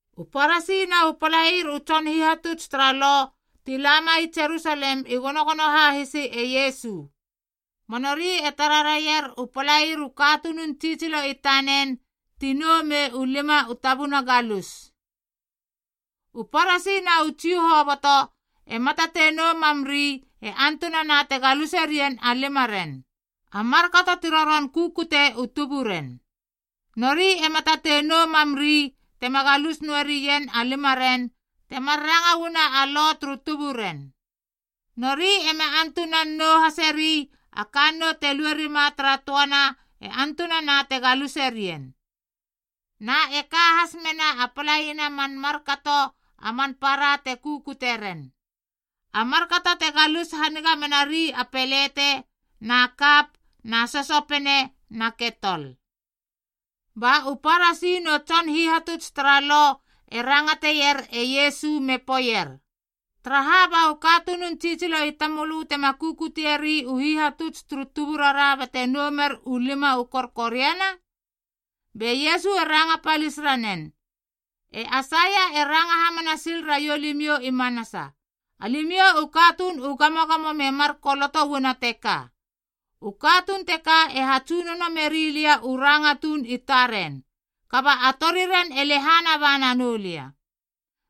U Parasi na u palair u tson hihatuts tara Lo ti lama i Jerusalem i gonogono hahisi e Iesu. Ba nori e tara raier a palair u katunun tsitsilo i tanen ti nou mei u lima u tabuna galus.a U Parasi na u Jiu hoboto ema tatei nou mamri e antunana te galuse rien a limaren, a markato ti roron kukute u tuburen. Nori ema tatei nou mamri tema galus noe rien a limaren temar ranga uana a lo turu tuburen. Nori ema antunan a nou haseri a kannou te lue rima tara töana e antunana te galuse rien. Na e ka has mena a palaina man markato a man para te kukute ren, a markato te galus haniga menari a pelete na kap na sosopene na ketol. Ba u Parasi nu tson hihatuts tara Lo e rangateier e Iesu me poeier, “Taraha ba u katunun tsitsilo i tamölö tema kukutieri u hihatuts turu tuburara bate nou mer u lima u korkoriana?” Be Iesu e ranga palis ranen, “E Aisaia e ranga hamana sil raiou limiou i manasa, alimiou u katuun u gamogamo me mar koloto uana teka, ‘U katuun teka e hatsunono meri lia u ranga tuun i taren, kaba a toriren e lehana ba nanou lia.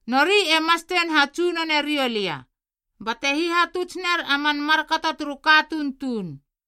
Nori e mastein hatsunone riou lia, bate hihatuts ner a man markato turu katuun tuun,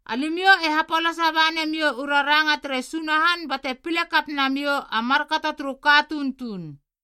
“Alimiou e hapolasa ba namiou u raranga tere Sunahan bate pile kap namiou a markato turu katuun tuun.”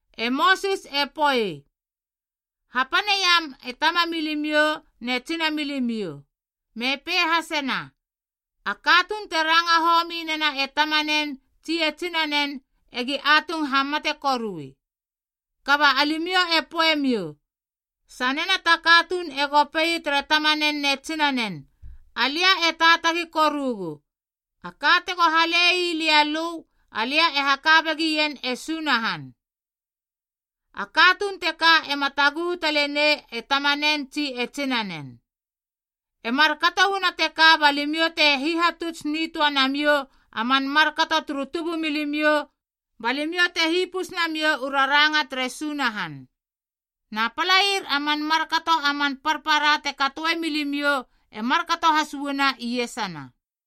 E Mosis e poei, ‘Hapaneiam e tamamilimiou ne tsinamilimiou,’ me pei hasena, ‘A katuun te ranga homi nena e tamanen tsi e tsinanen egi atung hamate korui.’ Kaba alimiou e poeiemiou, sanena ta katuun ego pei tere tamanen ne tsinanen, ‘Alia e taatagi korugu, a ka tego halei lia lö, alia e haka begien e Sunahan.’ A katuun teka ema taguhu tale nei e tamanen tsi e tsinanen. E markato uana teka ba limiou te hihatuts nitöa namiou a man markato turu tubumilimiou ba limiou te hipus namiou u raranga tere Sunahan. Na palair a man markato a man parpara te katoe milimiou e markato has uana iesana.”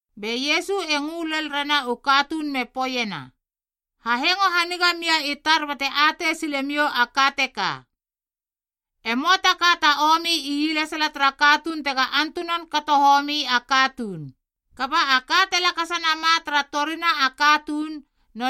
Be Iesu e ngö lel rena u katuun me poeiena, “Hahengo haniga mia i tar bate atei sile miou a ka teka. E möa ta ka ta omi ielesala tara katuun tega antunan kato homi a katuun, kaba a ka te lakasa nama tara torina a katuun, d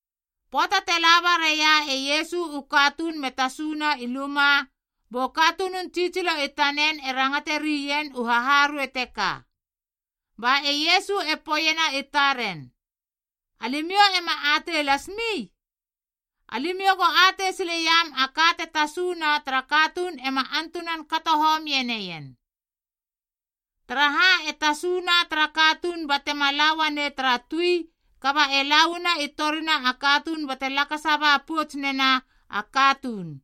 Pöata te laba raia e Iesu u katuun me tasuna i luma, bu katunun tsitsilo i tanen e rangate rien u haharuei teka. Ba e Iesu e poeiena i taren, “Alimiou ema atei lasmi? Alimiou go atei sileiam a ka te tasuna tara katuun ema antunan kato homie neien. Taraha, e tasuna tara katuun batema lauanei tara tui kaba e lauana i torina a katuun bate lakasa ba pouts nena a katuun.”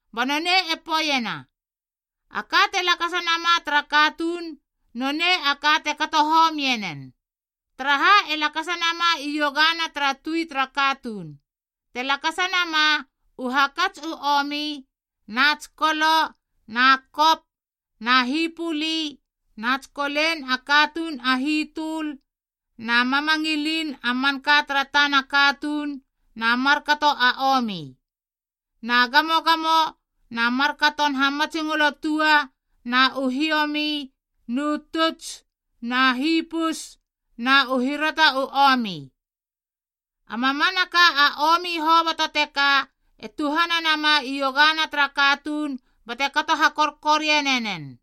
Ba nonei e peiena, “A ka te lakasa nama tara katuun, nonei a ka te kato homie nen. Taraha e lakasa nama iogana tara tui tara katuun, te lakasa nama: u hakats u omi, na tsikolo na kop na hipuli na tsikolen a katuun a hitöl na mamangilin a manka tara tana katuun na markato a omi. Na gamogamo na markaton hamatsingolo tua na u hiomi nu tuts na hipus na u hirata u omi. A mamanaka a omi hoboto teka e tuhana nama iogana tara katuun bate kato hakorkoriane nen.”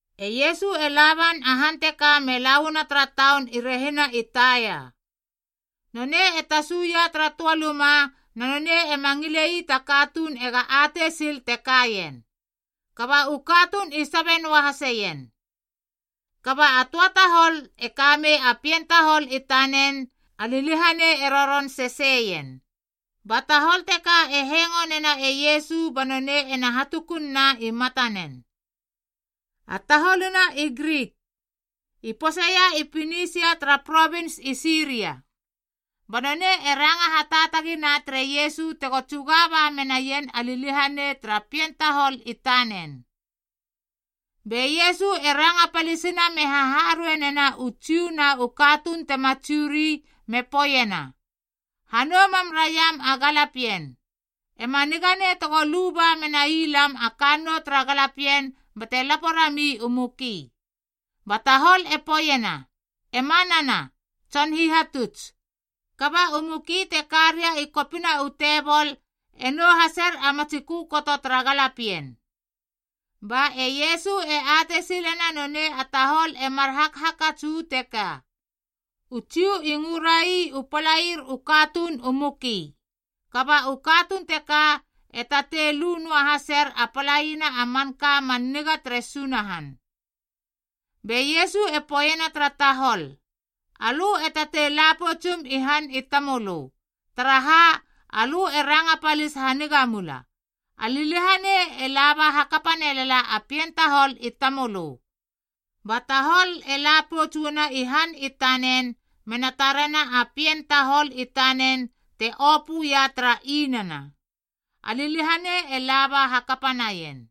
E Iesu e laban a han teka me la uana tara taun i rehina i Taia. Nonei e tasuia tara töa luma na nonei e ma ngile ii ta katuun ega atei sil te kaien. Kaba u katuun i sabe noa haseien. A töa tahol e kamei a pien tahol i tanen a liliahanei e roron sesei ien. Ba tahol teka e hengonena e Iesu ba nonei ena hatukun na i matanen. A taholuna i Grik, i poseia i Pinisia tara provins i Siria. Ba nonei e ranga hataatagina tere Iesu tego tsuga ba menaien a liliahanei tara pien tahol i tanen. Be Iesu e ranga palisina me haharuei nena u Jiu na u katuun tema Jiu ri me poeiena, “Hanou mam raiam a galapien. E ma niga nei tego lu menai lam a kannou tara galapien bate lapo rami u muki.” Ba tahol e poeiena, “E manana, Tson Hihatuts. Kaba u muki te karia i kopina u tebol e nou haser a matsi kökoto tara galapien.” Ba e Iesu e atei silena nonei a tahol e mar hakhakats uu teka: u Jiu i ngörai u palair u katuun u muki, kaba u katuun teka e tatei lu noa haser a palaina a manka man niga tere Sunahan. Be Iesu e poeiena tara tahol, “Alö e tatei la poutsum i han i tamölö, taraha alö e ranga palis haniga mula. A liliahanei e laba hakapa nelala a pien tahol i tamölö.” Ba tahol e la pouts uana i han i tanen mena tarena a pien tahol i tanen te opöia tara inana. A liliahanei e laba hakapa naien.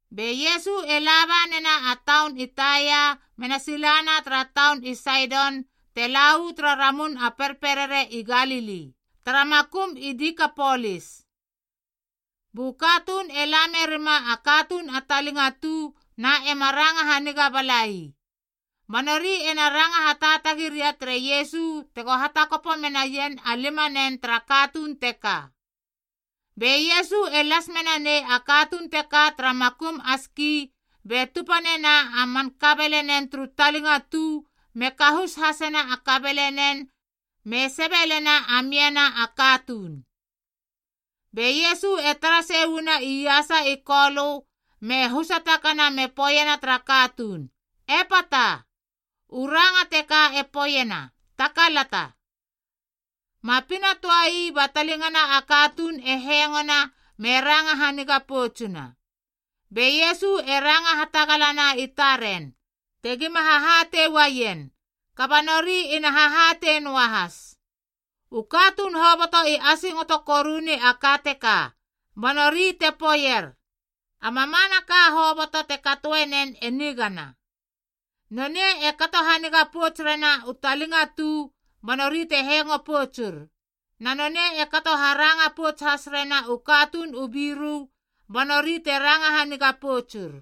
Be Iesu e laba nena a taun i Taia mena silana tara taun i Saidon te la uu tara ramun a perperere i Galili, tara makum i Dikapolis. Bu katuun e la merima a katuun a talingatu na ema ranga haniga balai. Ba nori ena ranga hataatagi ria tere Iesu tego hatakopo menaien a limanen tara katuun teka. Be Iesu e las menanei a katuun teka tara makum a ski be tupa nena a man kabelenen turu talingatu me kahus hasena a kabelenen me sebelena a miana a katuun. Be Iesu e tara sei uana iasa i Kolö me husa takana me poeiena tara katuun, “Epata.” U ranga teka e poeiena, “Takalata.” Ma pina töa ii ba talingana a katuun e hengona me ranga haniga poutsuna. Be Iesu e ranga hatagalana i taren, tegima hahatei uaien, kaba nori ina hahatei noahas. U katuun hoboto i asingoto koruni a ka teka, ba nori te poeier, “A mamanaka hoboto te katoenen e nigana. Nonei e kato haniga pouts rena u talingatu ba nori te hengo poutsur, na nonei e kato haranga pouts has rena u katuun u biru ba nori te ranga haniga poutsur.”